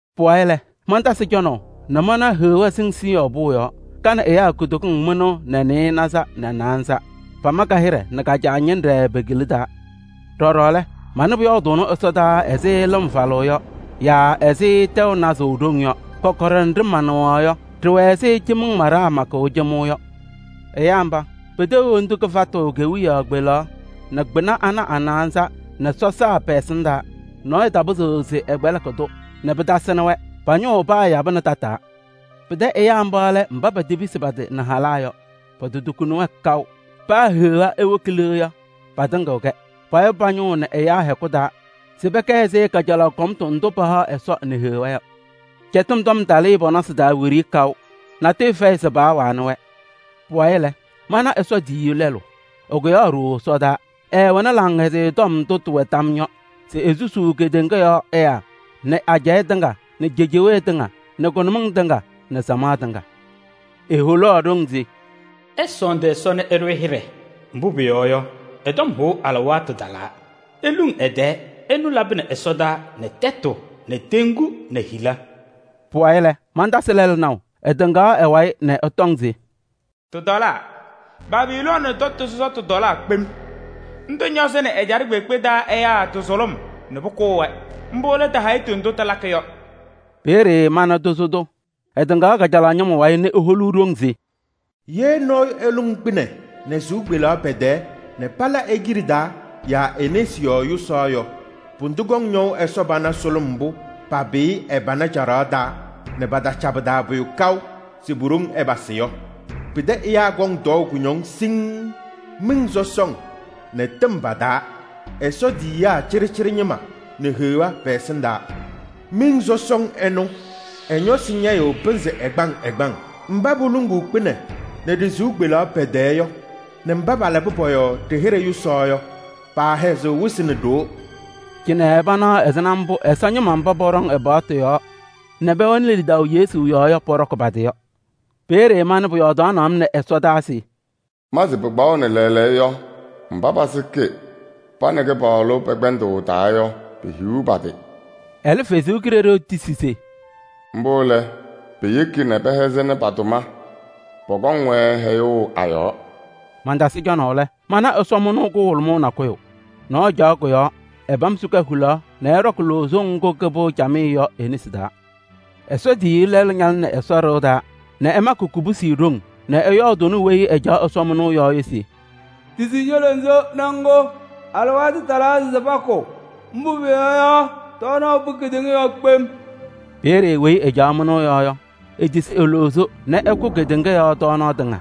Pʋwayɩ lɛ, mantasɩ cɔnaʋ nɛ manaɣ Heɣa sɩŋ Siiyɔɔ pʋʋ yɔɔ, ka nɛ ɛyaa kutokiŋ mɩnʋʋ nɛ nɩɩnaza nɛ naanza. Pama ka-hɩɖɛ nɛ ka-Caa ñɩnɖɛ pe-kila taa. Ɖɔɖɔ lɛ, manɩ pʋyɔɔdʋʋnɩ ɛsɔdaa ɛzɩ lɩm sɔsɔm falʋʋ yɔ yaa ɛzɩ tɛʋ nazʋʋʋ ɖoŋ yɔ. Kɔkɔɖɛ nɖɩ manɩɣaɣ yɔ, ɖɩwɛ ɛzɩ cɩmɩŋ maɖaa makʋʋ cɩmɩŋ yɔ. Ɛyaa mba, peteɣ hendu kɩfatʋ kewiyaɣ kpelaɣ nɛ kpɩna ana a-naanza nɛ sɔsaa pɛ-ɛsɩndaa. Nɔɔyʋ tapɩzɩɣ se ɛkpɛlɩkɩ-tʋ nɛ pɩtasɩnɩ-wɛ. Pa-ñʋʋ paayabɩnɩ tataa. Pɩtɛ ɛyaa mba lɛ mba petepisi pa-tɩ nɛ halaa yɔ, pototukuni-wɛ kaʋ. Paa Heɣa ewoki le yɔ, patɩŋɩɣ-kɛ. Payabɩ pa-ñʋʋ nɛ ɛyaa hɛkʋ taa se pɛkɛ ɛzɩ kajalaɣ kʋmtʋ ndʋ pahaɣ Ɛsɔ nɛ Heɣa yɔ. Cɛtɩm tɔm talɩɩ pɔ-nɔsɩ taa wiɖiyi kaʋ, natʋyʋ fɛyɩ se paawanɩ-wɛ. Pʋwayɩ lɛ, mana Ɛsɔ tiyiyu lɛlʋ, ɛkʋyaɣ ɖooo ɛsɔdaa. Ɛɛwɛnɩ Laŋhɛzɩyɛ Tɔm ndʋ tɩwɛ tam yɔɔ yɔ se esusuu kedeŋa yɔɔ ɛyaa nɛ ajɛɛ tɩŋa nɛ cejewee tɩŋa nɛ kʋnʋmɩŋ tɩŋa nɛ samaɣ tɩŋa. Eholaɣ ɖoŋ se: “Ɩsɔɔndɩ Ɛsɔ nɛ ɩɖʋ-ɩ hɩɖɛ, mbʋ pʋyɔɔ yɔ, ɛ-tɔm hʋʋ alɩwaatʋ talaa. Iluŋ ɛ-tɛɛ! Ɛnʋ labɩnɩ ɛsɔtɔnʋʋ nɛ tɛtʋ nɛ teŋgu nɛ hila.” Pʋwayɩ lɛ, mantasɩ lɛlʋ naʋ, ɛtɩŋaɣ ɛ-wayɩ nɛ ɛtɔŋ se: “Tɩtɔlaa! Babilooni tɛtʋ sɔsɔtʋ tɔlaa kpem! Ndʋ ñɔzɩnɩ ajɛɛ kpeekpe taa ɛyaa tɩ-sʋlʋm nɛ pʋkʋʋ-wɛ, mbʋ lɛ tɩ-hayitu ndʋ tɩlakɩ yɔ.” Peeye mana tozo tʋ, ɛtɩŋaɣ kajalaɣ ñɩma wayɩ nɛ eholuu ɖoŋ se: “Ye nɔɔyʋ eluŋ kpɩnɛ nɛ ɖɩ-sɩʋ kpeleɣ pɛ-tɛɛ nɛ pala e-kiɖe taa yaa e-nesi yɔɔ yʋsaɣ yɔ, pʋdʋ kɔŋ ñɔʋ Ɛsɔ pana sʋlʋm mbʋ papɩyɩ ɛ-pana caɖaɣ taa nɛ pataca pɩ-taa pʋyʋ kaʋ se pu-ɖoŋ ɛpasɩ yɔ: pɩtɛ ɛyaa kɔŋ tɔɔʋ kʋñɔŋ siŋŋ miŋ sɔsɔŋ nɛ tɩm pa-taa, Ɛsɔ tiyiyaa cɩɖɩcɩɖɩ ñɩma nɛ Heɣa pɛ-ɛsɩndaa. Miŋ sɔsɔŋ ɛnʋ, ɛ-ñɔsɩ ñɛyɩɣ pɩnzɩ ɛgbaŋ ɛgbaŋ. Mba poluŋuu kpɩnɛ nɛ ɖɩ-sɩʋ kpeleɣ pɛ-tɛɛ yɔ nɛ mba palabɩ pɔ-yɔɔ ɖɩ-hɩɖɛ yʋsaɣ yɔ, paahɛzɩɣ wɩsɩ nɛ ɖoo.” Cɩnɛ panaɣ ɛzɩma mbʋ Ɛsɔ ñɩma mba pɔɖɔŋ ɛ-paɣtʋ yɔɔ nɛ pɛwɛnɩ lidaʋ Yesu yɔɔ yɔ pɔɖɔkɩ pa-tɩ yɔ. Peeye manɩ pʋyɔɔdʋʋnɩ-m nɛ ɛsɔdaa se: “Ma se pɩkpaɣʋnɩ lɛɛlɛɛyɔ yɔ, mba pasɩkɩ pa nɛ Kɩpaɣlʋ pɛ-kpɛndʋʋ taa yɔ, pehiɣ pa-tɩ!” Ɛlɛ Ɛsɔ Kalɩzaɣ tisi se: “Mbʋ lɛ! Piyeki nɛ pɛhɛzɩnɩ pa-tʋma: pɔkɔŋ-wɛ hɛyʋʋ a-yɔɔ.” Mantasɩ cɔnaʋ lɛ, mana ɛsɔmɩnʋʋ kʋhʋlʋmʋʋ nakʋyʋ. Nɔɔyʋ caɣ kʋ-yɔɔ, ɛpam sika hulaɣ nɛ ɛɖɔkɩ loozo ŋgʋ kɩpɩɣ camɩyɛ yɔ e-nesi taa. Ɛsɔ tiyiyu lɛlʋ ñalɩnɩ Ɛsɔ ɖɩɣa taa nɛ ɛmakɩ kubusi ɖoŋ nɛ ɛyɔɔdʋʋnɩ weyi ɛcaɣ ɛsɔmɩnʋʋ yɔɔ yɔ se: “Tisi ño-loozo nɛ ŋkʋ. Alɩwaatʋ talaa se pakʋ, mbʋ pʋyɔɔ yɔ, tɔɔnaɣ pɩ kedeŋa yɔɔ kpem!” Peeye weyi ɛcaɣ mɩnʋʋ yɔɔ yɔ, etisi e-loozo nɛ ɛkʋ kedeŋa yɔɔ tɔɔnaɣ tɩŋa.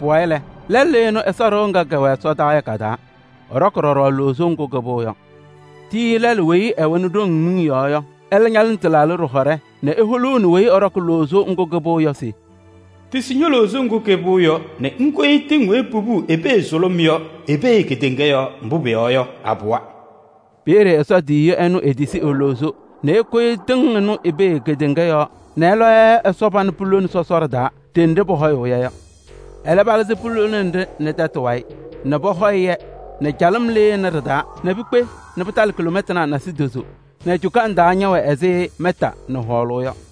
Pʋwayɩ lɛ, lɛlʋ lɩnɩ Ɛsɔ ɖɩɣa ŋga kɛwɛ ɛsɔdaa yɔ ka-taa, ɛɖɔkɩ ɖɔɖɔ loozo ŋgʋ kɩpɩɣ yɔ. Tiyiyu lɛlʋ weyi ɛwɛnɩ ɖoŋ miŋ yɔɔ yɔ, ɛlɛ ñalɩnɩ tɩlaaɖɩ ɖɩhɔɖɛ nɛ eholuuni weyi ɛɖɔkɩ loozo ŋgʋ kɩpɩɣ yɔ se: “Tisi ño-loozo ŋgʋ kɩpɩɣ yɔ nɛ ŋkoyi tɩŋ weyi popuu i-pee sʋlʋm yɔ i-pee kedeŋa yɔɔ, mbʋ pʋyɔɔ yɔ, apɩwa.” Peeye Ɛsɔ tiyiyu ɛnʋ etisi e-loozo nɛ ekoyi tɩŋ ɩnʋ i-pee kedeŋa yɔɔ nɛ ɛlɔ-yɛ Ɛsɔ pana pulone sɔsɔɖɛ taa ɖenɖe pɔhɔyʋʋ-yɛ yɔ. Ɛlɛ palɩzɩ pulone nɖɩ nɛ tɛtʋ wayɩ nɛ pɔhɔyɩ-yɛ nɛ calɩm lɩnɩ ɖɩ-taa nɛ pikpe nɛ pɩtalɩ kiloomɛtanaa nasidozo nɛ cukaŋ taa ñɛwɛ ɛzɩ mɛta nɛ hɔɔlʋʋ yɔ.